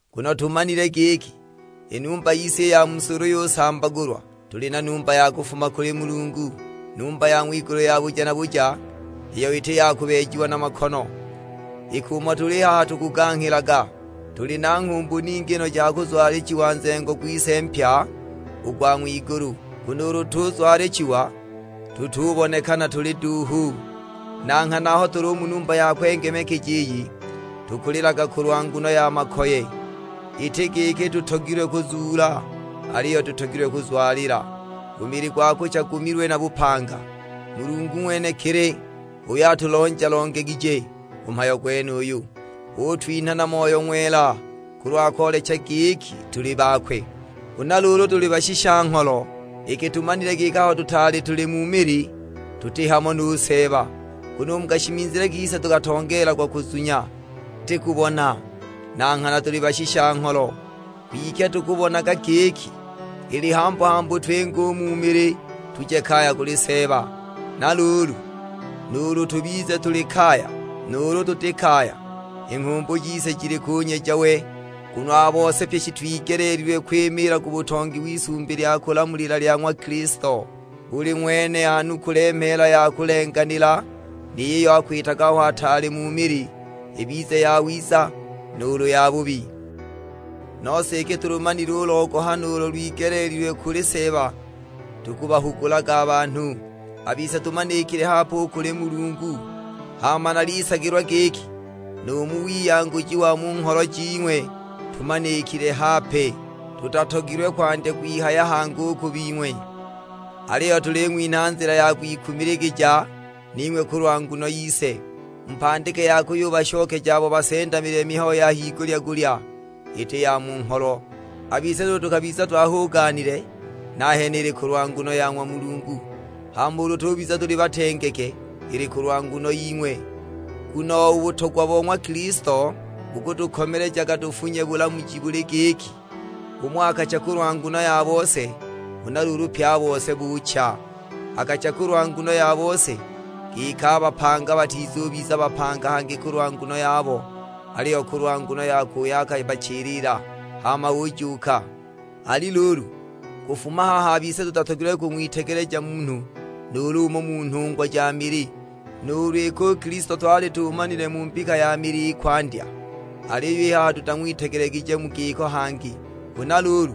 Nguno tumanile giki, i numba yise i ya mu si ulu yusambagulwa, tuli na numba ya kufuma kuli Mulungu; numba ya ng'wigulu ya buja na buja, iyo iti ya kubeejiwa na makono. Iki umo tuli i haha tukuganghilaga, tuli na nghumbu ningi no ja kuzwalichiwa nzengo gwise mpya, u gwa ng'wigulu. Nguno ulu tuzwalichiwa, tutubonekana tuli duuhu. Na nghana aho tuli u mu numba ya kwengemekeja iyi, tukulilaga kulwa nguno ya makoye; iti giki tutogilwe kuzuula, aliyo tutogilwe kuzwalila, u mili gwa kucha gumilwe na bupanga. Mulungu ng'wenekili h'uyo atulonja-longegije u mhayo gwenuyu, utwinha na Moyo Ng'wela kulwa koolecha giki tuli bakwe. Huna luulu tuli bashisha-ngholo, iki tumanile giki aho tutaali tuli mu mili tuti hamo nu Seeba. Nguno u mu kashimizile kise tukatongeelagwa kuzunya, iti kubona. Na nghana tuli bashisha-ngholo, kwike tukubonaga giki, ili hambu-hambu twinge u mu mili tuje kaya kuli Seeba. Na luulu, nuulu tubize tuli kaya, nuulu tuti kaya, i nghumbu jise jili kunyeja we. Nguno a bose pye shitwigeleelilwe kwimiila ku butongi w'isumbi lya kulamulila lya ng'wa Kilisto; buli ng'wene anukule mheela ya kulenganila ni yiyo akwitaga aho ataali mu mili, ibize yawiza, nuulu yabubi. Nose iki tulumanile u logohano ulo lwigeleelilwe kuli Seeba, tukubahugulaga a banhu. A bise tumanikile hape u kuli Mulungu, hama nalisagilwa giki nu mu wiyanguji wa mu ngholo jing'we tumanikile hape. Tutatogilwe kwandya kwihaya hangi u ku bing'we, aliyo tuling'winha nzila ya kwikumiligija ning'we kulwa nguno yise; mupandike ya kuyubashokeja abo basendamilile mihayo ya higulya-gulya: iti ya mu ngholo. A bise nuulu tukabiza twahuganile, nahene ili kulwa nguno ya ng'wa Mulungu; hama ulu tubiza tuli batengeke, ili kulwa nguno ying'we. Nguno u butogwa bo ng'wa Kilisto bukutukomelejaga tufunye bulamuji buli giki, umo akacha kulwa nguno ya bose, huna luulu pye a bose buucha! Akacha kulwa nguno ya bose, giki a bapanga batizubiza bapanga hangi kulwa nguno yabo; aliyo kulwa nguno yakwe uyo akabachilila, hama ujuuka. Ali luulu, kufuma haha a bise tutatogilwe kung'witegeleja munhu nuulu umo mu nhungwa ja mili; nuulu iki u Kilisto twali tumanile mu mbika ya mili i kwandya, aliyo i haha tutang'witegelegije mu giko hangi. Huna luulu,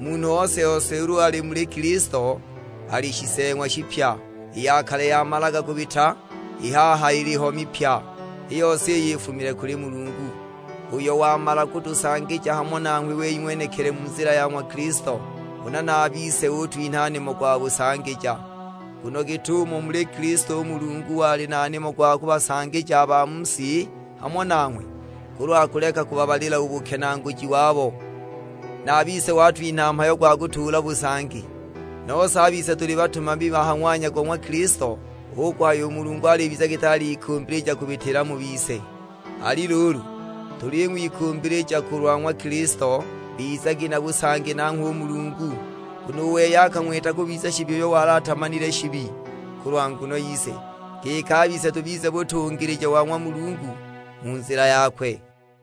munhu ose-ose ulu ali muli Kilisto, ali shiseeng'wa shipya; i ya kale yamalaga kubita, i haha iliho mipya. I yose iyi ifumile kuli Mulungu, uyo wamala kutusangija hamo nanghwe wei ng'wenekili mu nzila ya ng'wa Kilisto; huna na a bise utwinha nimo gwa busangija. Nguno git'umo u muli Kilisto u Mulungu wali na nimo gwa kubasangija a ba mu si hamo nanghwe, kulwa kuleka kubabalila u bukenaaguji wabo, na a bise watwinha mhayo gwa kutuula busangi. Nose a bise tuli batumami ha ng'wanya go ng'wa Kilisto, hu kuhaya u Mulungu alibiza giti alikumbilija kubitila mu bise. Ali luulu, tuling'wikumbilija kulwa ng'wa Kilisto, bizagi na busangi nanghwe u Mulungu. Nguno u wei akang'wita kubiza shibi uyo wali atamanile shibi, kulwa nguno yise; giki a bise tubize butungilija wa ng'wa Mulungu mu nzila yakwe.